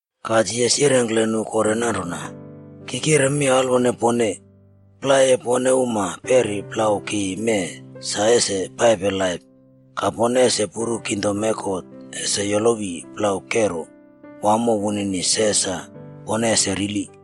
Ka Jisas yirengkle nu kore nanrona, “Ki kire mi alwone pone, plai e pone uma peri plau ki mee sa ese paipe laip ka pone ese puru kingdom e God ese yolowi plau kero wamo wunini se sa pone ese rili.”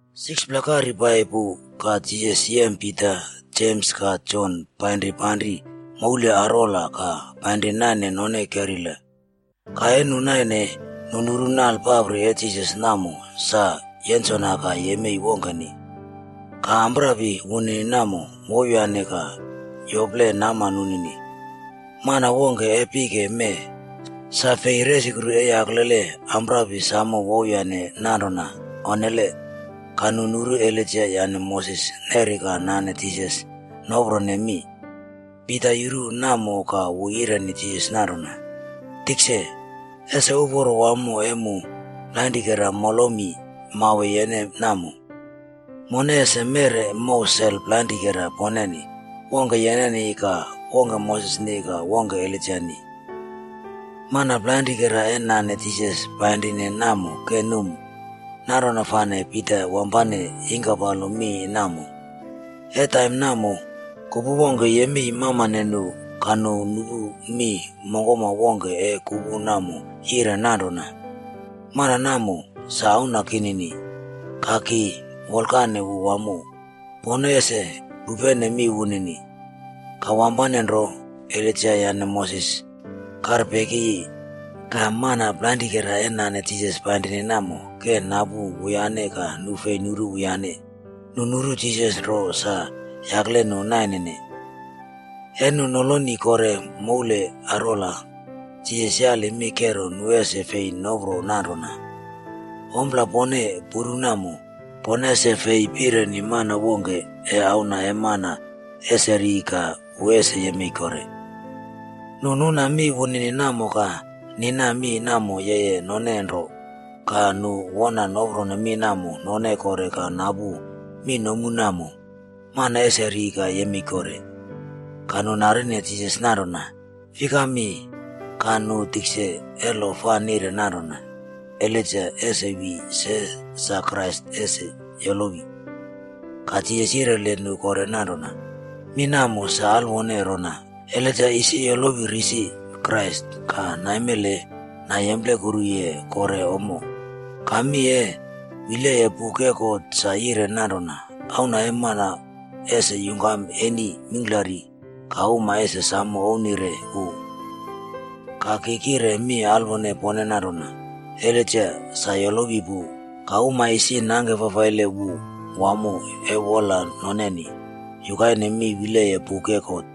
6pla kaire pai pu ka Jisas yem Pita, Jems ka Jon painri panri moule arwola ka painri naine non keila. Ka e nu naine, nu nuru nale papri e Jisas namo sa yensona ka yemei wongkeni. Ka amprapi wunini namo wouwyane ka yople nama nunini. Mana wongke e pike mee sa fei resukru e yaklele amprapi samo wouwyane nanrona, onnele. Ka nu nuru Elaija yane Moses neri ka nane Jisas noprone mi. Pita yuru namo ka wu yireni Jisas nanrona, “Tikse, ese uporo wamo e mu plainrikera molomi mauwe yene namo. Mone ese meꞌre mow sel plainrikera poneni. Wongke yeneni, ka wongke Mosesni ka wongke Elaijani.” Mana plainrikera e nane Jisas painri namo ke num, nanrona fane Pita wampane yingkapalo mi namo. E taim namo, kupu wongke yemei mamane nu ka nu nupu mi mongkoma wongke e kupu namo yire nanrona, “Mana namo, sa Auna kinini! Ka ki wolkane wu wamo. Pone ese pupene mi wunini.” Ka wampane nro, Elaija yane Moses karpekiyi ka mana plainrikera e nane Jisas painri namo ke napu wuyane ka nu fi nuru wuyane. Nu nuru Jisas nro sa yakle nu naine. E nu nolone kore moule arwola, Jisas yali mi kero nu ese fi nopro nanrona, “Ompla pone puru namo, pone ese fei pireni mana wongke e Auna e Mana ese ri ka wu ese yemei kore.” Nu nuna mi wunini namo ka nina mi namo yeye none nro. Ka nu wona nopro mi namo none kore ka napu mi nomu namo “mana ese ri ka yemei kore.” Ka nu narine Jisas nanrona, “Fikami ka nu tikse e lo fa nire nanrona Elaija ese wi se sa Krais ese yolowi?” Ka Jisas yireli nu kore nanrona, “Mi namo sa alwone rona: Elaija isi yolowi risi Krais ka naimele nayemplekuru kore ommo. Ka mi e wileye Buk e God sa yire nanrona Auna e Mana ese yungkam eni mingklari ka uma ese samo ouwnire wu.” Ka ki kire mi alwone pone nanrona, “Elaijaa sa yolowi pu, ka uma isi nangke fafaile wu wamo e wola noneni, yukaine mi wileye buk e God.”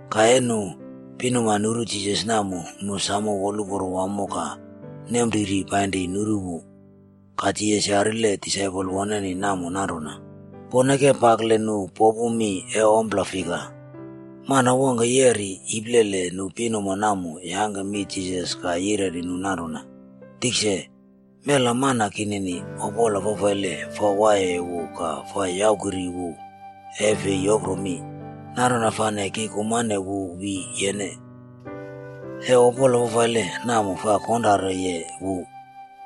Ka e nu pinuma nuru Jisas namo, nu samo woluporo wamo ka nempriri painri nuru wu. Ka Jisas yarile disaipol woneni namo nanrona, “Pone ke pakle nu nopu mi e ompla fika?” Mana wongke yeri iplele nu pinuma namo yangke mi Jisas ka yireni wu nanrona, “Tikse, mela mana kinini, opola fafaile fa waiye wu ka fa yaukiri wu e fi yopro mi. Nanrona fane ki kumane wu wi yene. E opola fafaile namo fa konrareye wu,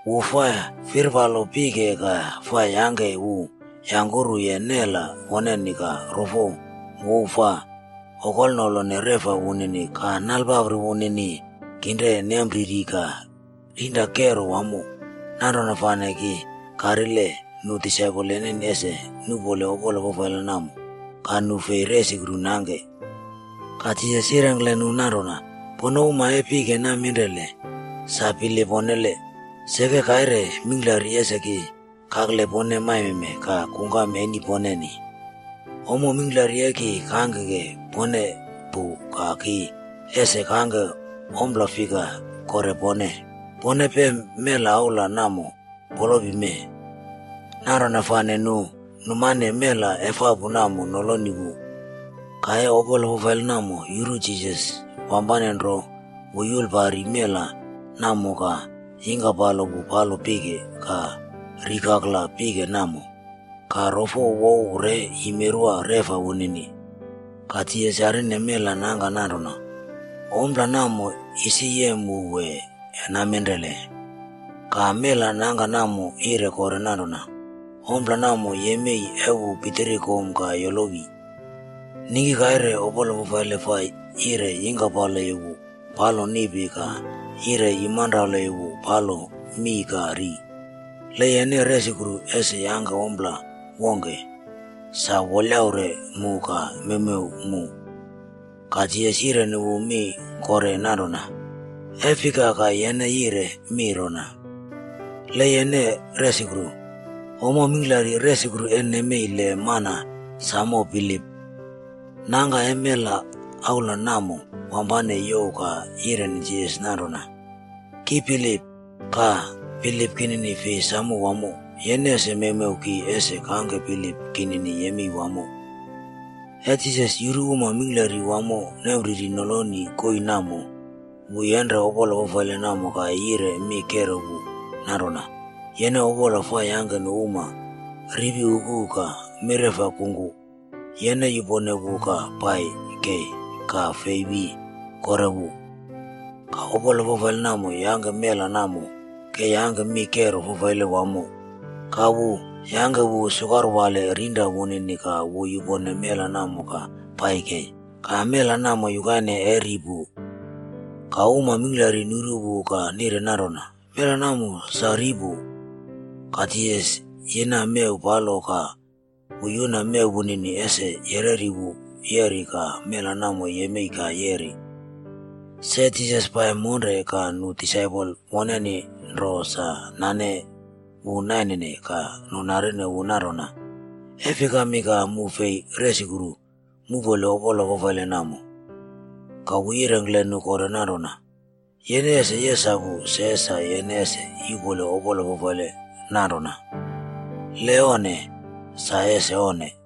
wu fa firpaloye pike ka fa yangke wu yangkuru nela woneni ka rofo wouw fa okonolene reꞌfa wunini ka nale papri wunini kinre nempriri ka rinra kero wamo. Nanrona fane ki karile nu disaipol yeneni ese nuꞌpole opola fafaile namo, ka nu fi resukru nangke.” Ka Jisas yirengkle nu nanrona, “Pone uma e pike naminrele, sa bilip onnele! Seke kaire mingklari ese ki kakle pone maime ka kungkam eni poneni. Ommo mingklari e ki kangke pone pu ka ki ese kangke ompla fika kore pone? Pone pem mela aula namo polopi mee.” Nanrona fane nu numane mela efapu namo noloni wu. Ka e opola fafaile namo yuru Jisas, wampane nro wu yulpari mela namo ka yingkaplo wu palo pike ka rikaklaye pike namo, ka rofo wouw re yimerwa reꞌfa wunini. Ka Jisas yarine mela nangka nanrona, “Ompla namo isi yem wu wee, naminrele?” Ka mela nangka namo yire kore nanrona, “Ompla namo yemei e wu pitiri kom ka yolowi. Ningki kaire, opola fafaile fa yire yingkaplo wu palo niꞌpi ka yire yumanralo wu palo mii ka ri. Le yene resukru ese yangke ompla wongke, samo wolyaure mu ka mewmew mu.” Ka Jisas yireni wu mi kore nanrona, “E fika ka yene yire mi rona ‘Le yene resukru’? Ommo mingklari resukru e nemei le mana samo bilip.” Nangka e mela aula namo wampane youw ka yireni Jisas nanrona, “Ki bilip, ka bilip kinin fi samo wamo. Yene ese mewmew ki ese kangke bilip kinini yemei wamo.” E Jisas yuru uma mingklari wamo nempriri noloni koii namo wu yenre opola fafaile namo ka yire mi kero wu nanrona, “Yene opola fa yangke nu uma ripi uku ka mireꞌf kungku. Yene yupone wu ka pai kei ka fi wi kore wu.” Ka opola fafaile namo yangke mela namo ke yangke mi kero fafaile wamo, ka wu yangke wu sukarwale rinra wunini ka wu yupone mela namo ka pai kei. Ka mela namo yukaine e ri pu. Ka uma mingklari nuru wu ka nire nanrona, “Mela namo sa ri pu.” Ka Jisas yina mew palo ka wu yuna mew wunini ese yereri wu yeri ka mela namo yemei ka yeri. Se Jisas pai monre ka nu disaipol woneni nro sa nane wu nainene ka nu narine wu nanrona, “Fikami ka mu fi resukru muꞌpole opola fafaile namo?” Ka wu yirengkle nu kore nanrona, “Yene ese yesapu se sa yene ese yuꞌpole opola fafaile nananrona. Le onne, sa ese onne.”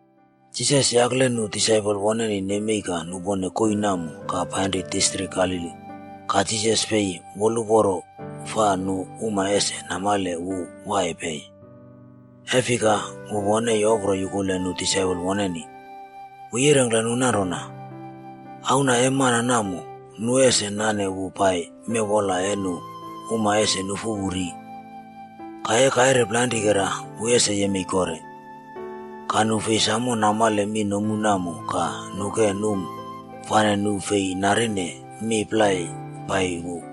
Jisas yakle nu disaipol woneni nemei ka nupone koii namo ka painri distrik Galili. Ka Jisas fi woluporo fa nu uma ese namale wu waiye pei, e fika wu wona yopro yukule nu disaipol woneni. Wu yirengkle nu nanrona, “Auna e Mana namo, nu ese nane wu pai mewwola e nu uma ese nufu wu ri. Ka e kaire plainrikera wu ese yemei kore.” Ka nu fi samo namale mi nomu namo ka nu ke num fane fei narine mi plai pai wu.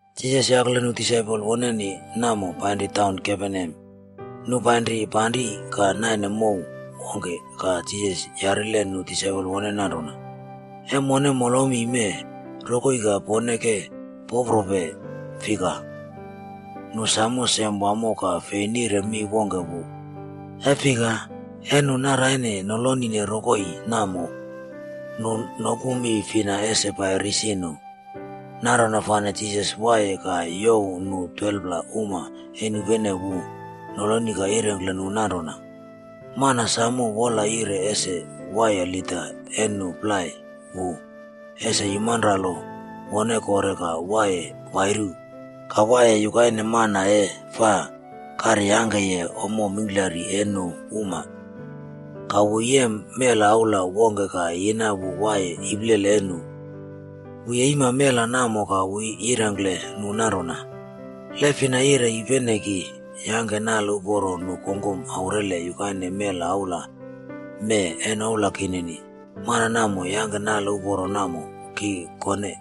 Jisas yakle nu disaipol woneni namo painri taun Kaperneam. Nu painri panri ka naine mow wongke ka Jisas yarile nu disaipol woneni nanrona, “E mone molomime rokoi ka pone ke poprope fika?” Nu samo sem wamo ka fi nire mi wongke wu. E fika, e nu naraine nolonine rokoi namo, nu nopu mi fina ese pai risi nu. Nanrona fane Jisas waiye ka youw nu 12pla uma e nupene wu noloni ka yirengkle nu nanrona, “Mana samo wola yire ese waiye lida e nu plai wu, ese yumanralo wone kore ka waiye wairu ka waiye yukaine mana e fa karyangkeye ommo mingklari e nu uma.” Ka wu yem mela aula wongke ka yina wu waiye iplele e nu. Wu yeima mela namo ka wu yirengkle nu nanrona, “Le fina yire yupene ki yangke nale uporo nu kongkom aurele yukaine mela aula mee e noula kinini, mana namo yangke nale uporo namo ki kone.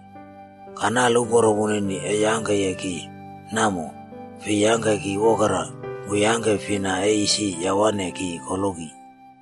Ka nale uporo wunini e yangkeye ki namo, fi yangke ki wokera, wu yangke fina e isi yawane ki koloki.”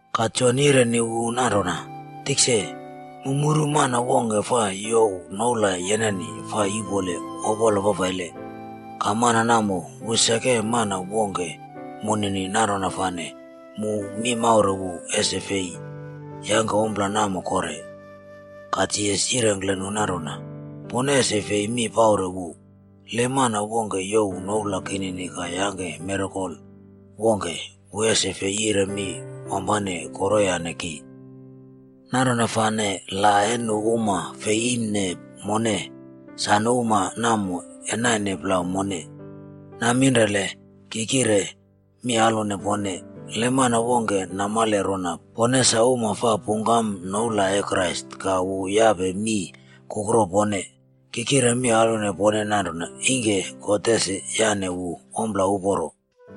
Ka Jon yireni wu nanrona, “Tikse, mu muru mana wongke fa youw noula yeneni fa yuꞌpole opola fafaile. Ka mana namo wu seke mana wongke moneni nanrona fane mu mi maure wu ese fi yangke ompla namo kore.” Ka Jisas yirengkle nu nanrona, “Pone ese fi mi paure wu. Le mana wongke youw noula kinini ka yangke mirakel wongke, wu ese fi yire mi wampane koroyane ki. Nanrona fane la e nu uma fei iimne mone, sa nu uma namo e naine plau mone. Naminrele ki kire mi alwone pone, le mana wongke namale rona pone sa uma fa pungkam noula e Krais ka wu yape mii kukro pone, ki kire mi alwone pone nanrona ingke God ese yane wu ompla uporo.”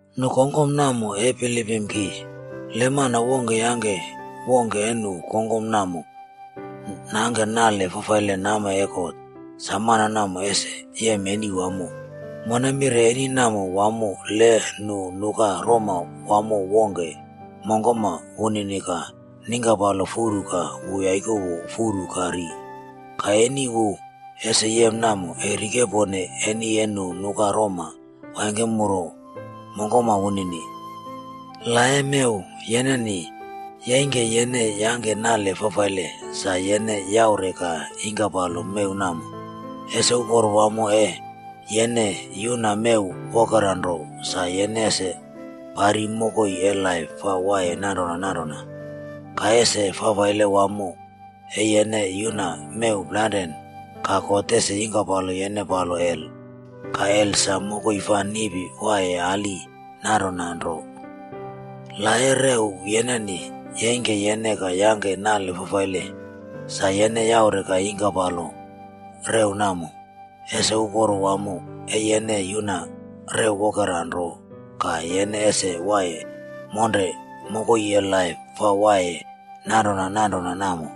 “Nu kongkom namo e bilipim ki. Le mana wongke yangke wongke e nu kongkom namo nangke nale fafaile nama e God, sa mana namo ese yem eni wamo. Mone mire eni namo wamo le nu nuka roma wamo wongke mongkoma wunini ka ningkapalo furu ka wu yaikowo furu ka ri. Ka eni wu ese yem namo e rikepone eni e nu nuka roma waingkemuru mongkoma wunini. La e mew yeneni yeingke yene yangke nale fafaile, sa yene yaure ka yingkapalo mew namo. Ese uporo wamo e yene yuna mew wokera nro sa yene ese pari mokoi e laip fa waiye nanrona nanrona. Ka ese fafaile wamo e yene yuna mew plainrane, ka God ese yingkapalo yene palo hel. Ka hel sa mokoi fa niꞌpi waiye ali nanrona nro. La e rew yeneni yeingke yene ka yangke nale fafaile, sa yene yaure ka yingkapalo rew namo. Ese uporo wamo e yene yuna rew wokera nro ka yene ese waiye monre mokoi e laip fa waiye nanrona nanrona namo.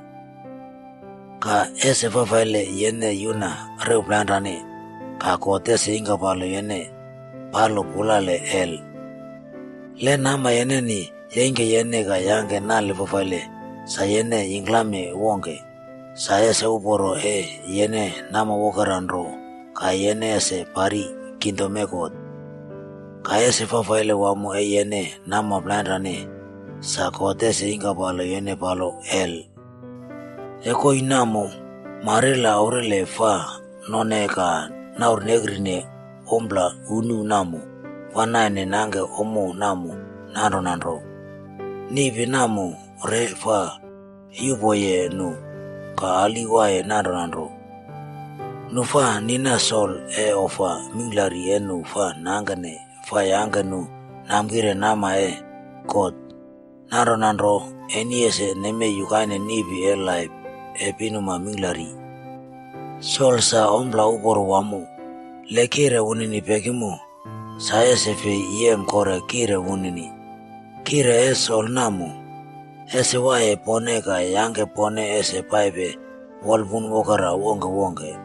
Ka, ese fafaile yene yuna rew plainrane ka God ese yingkapalo yene pai palo hel. Le nama yeneni yeingke yene ka yangke nale fafaile, sa yene yingklame wongke. Sa ese uporo e yene nama wokera nro ka yene ese pari kingdom e God. Ka, ese fafaile wamo e yene nama plainrane sa God ese yingkapalo yene palo hel. E koii namo, marila aure fa none ka naurnekri ompla unu namo, fa naine nangke ommo namo nanrona nro. Niꞌpi namo re fa yupoye nu, ka ali waiye nanrona nro.” “Nu fa nina sol e ofa mingklari e nu fa nangkene fa yangke nu namkire nama e God.b Nanrona nro, eni ese nemei yukaine niꞌpi e laip e pinuma mingklari.” “Sol sa ompla uporo wamo. Le kiꞌre wunini pekimo, sa ese fi yem kore kiꞌre wunini. Kiꞌre e sol namo, ese waiye pone ka yangke pone ese paipe wolpun wokera wongkwongke.”